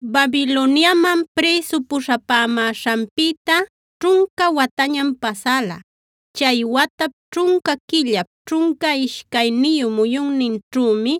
Babiloniaman prïsu puśhapämäśhanpïta ćhunca watañam pasäla. Chay watap ćhunca quillap, ćhunca ishcayniyu muyunninćhümi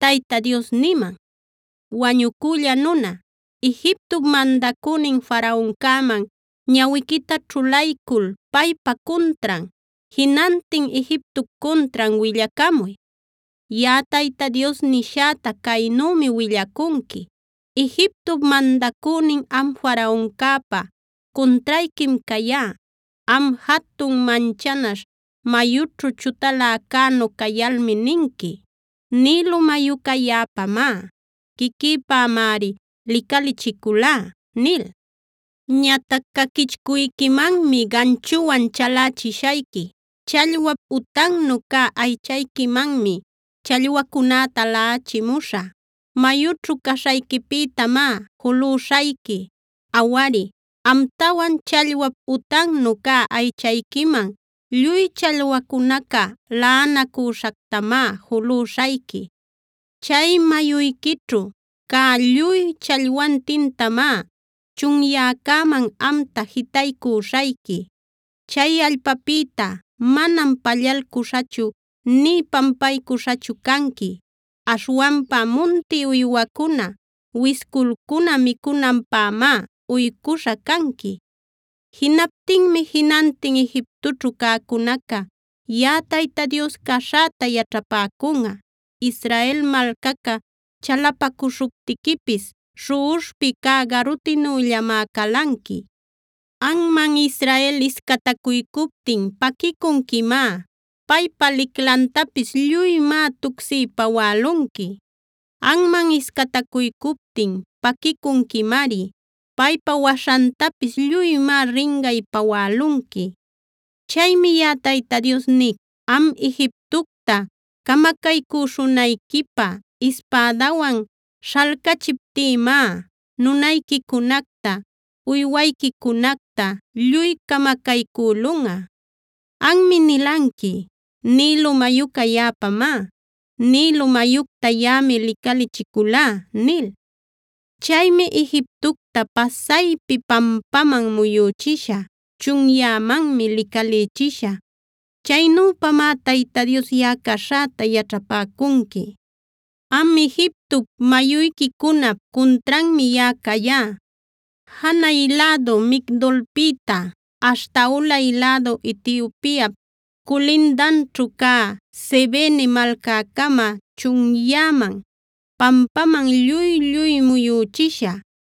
Tayta Dios niman: “Wañucülla nuna, Egiptop mandacünin Faraoncäman ñawiquita ćhulaycul paypa cuntran, jinantin Egiptop cuntran willacamuy. Yaꞌa Tayta Dios nishäta caynümi willacunqui: “Egiptop mandacünin am Faraoncäpa cuntrayquim cayá. Am, jatun manchanaśh, mayućhu chutaläcänu cayalmi ninqui: ‘Nilo mayuca yaꞌapamá. Quiquïpämari licalichiculá’ nil. Ñatac caquichcuyquimanmi ganchuwan chalächishayqui. Challwap utannu cä aychayquimanmi challwacunäta laꞌachimuśhä. Mayućhu caśhayquipïtamá julüśhayqui. Awari, amtawan challwap utannu cä aychayquiman lluy challwacunaca laꞌanacüśhactamá julüśhayqui. Chay mayuyquićhu cä lluy challwantintamá chunyäcaman amta jitaycüśhayqui. Chay allpapïta manam pallalcuśhachu nï pampaycuśhachu canqui. Aśhwanpa munti uywacuna, wisculcuna micunanpämá uycuśha canqui. “Jinaptinmi jinantin Egiptoćhu cäcunaca yaꞌa Tayta Dios caśhäta yaćhapäcunꞌa. Israel malcaca chalapacuśhuptiquipis śhuꞌuśhpi cä garutinüllamá calanqui. Anman Israel iscatacuycuptin paquicunquimá; paypa liclantapis lluymá tucsiy pawälunqui. Anman iscatacuycuptin paquicunquimari; paypa waśhantapis lluymá ringay pawälunqui. “Chaymi yaꞌa Tayta Dios nic: Am Egiptocta camacaycüśhunayquipä ispädawan śhalcachiptïmá nunayquicunacta, uywayquicunacta lluy camacaycülunꞌa. Anmi nilanqui: ‘Nilo mayuca yaꞌapamá; Nilo mayucta yaꞌami licalichiculá’ nil. Chaymi Egiptocta pasaypi pampaman muyüchishä; chunyämanmi licalïchishä. Chaynüpamá Tayta Dios yaꞌa caśhäta yaćhapäcunqui. Am Egiptop mayuyquicunap cuntranmi yaꞌa cayá. Janay lädu Migdolpïta aśhta ulay lädu Etiopiap culindanćhu cä Sevene malcäcamam chunyäman, pampaman lluy-lluy muyüchishä.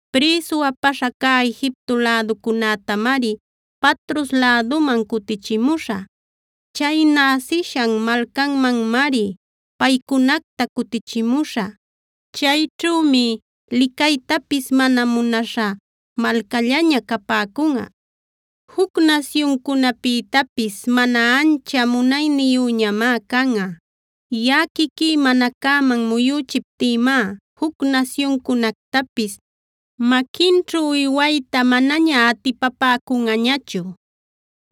Prïsu apaśha cä Egipto läducunätamari Patros läduman cutichimuśhä. Chay näsishan malcanmanmari paycunacta cutichimuśhä. Chayćhümi licaytapis mana munaśha malcallaña capäcunꞌa. Juc nasyuncunapïtapis mana ancha munayniyüñamá canꞌa. Yaꞌa quiquí mana cäman muyüchiptïmá juc nasyuncunactapis maquinćhu uywayta manaña atipapäcunꞌañachu.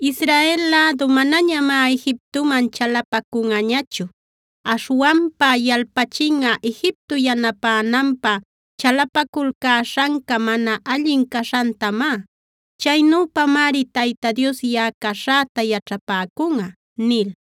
Israel lädu manañamá Egiptoman chalapacunꞌañachu. Aśhwanpa yalpachinꞌa Egipto yanapänanpä chalapaculcäśhanca mana allin caśhantamá. Chaynüpamari Tayta Dios yaꞌa caśhäta yaćhapäcunꞌa” nil.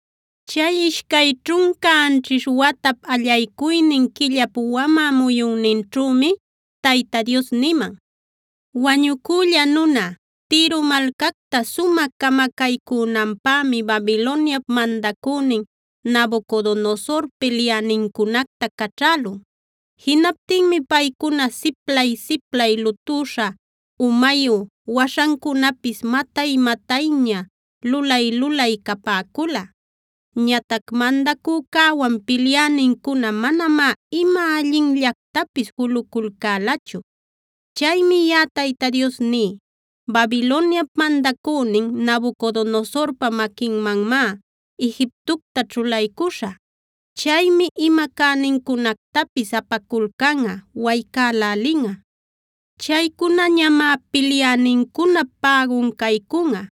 Chay ishcay ćhunca anćhish watap, allaycuynin quillap wamä muyunninćhümi Tayta Dios niman: “Wañucülla nuna, Tiro malcacta sumä camacaycünanpämi Babiloniap mandacünin Nabucodonosor pilyänincunacta caćhälun. Jinaptinmi paycuna siplay-siplay lutüśha umayu, waśhancunapis matay-matayña lulay-lulay capäcula. Ñatac mandacücäwan pilyänincuna manamá ima allinllactapis juluculcälachu. Chaymi yaꞌa Tayta Dios ní: Babiloniap mandacünin Nabucodonosorpa maquinmanmá Egiptocta ćhulaycuśhä. Chaymi ima cänincunactapis apaculcanꞌa, waycälälinꞌa. Chaycunañamá pilyänincunap pägun caycunꞌa.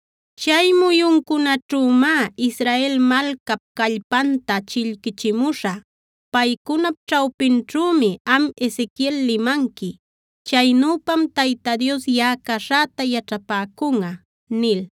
“Chay muyuncunaćhümá Israel malcap callpanta chillquichimuśhä. Paycunap ćhawpinćhümi am Ezequiel limanqui. Chaynüpam Tayta Dios yaꞌa caśhäta yaćhapäcunꞌa” nil.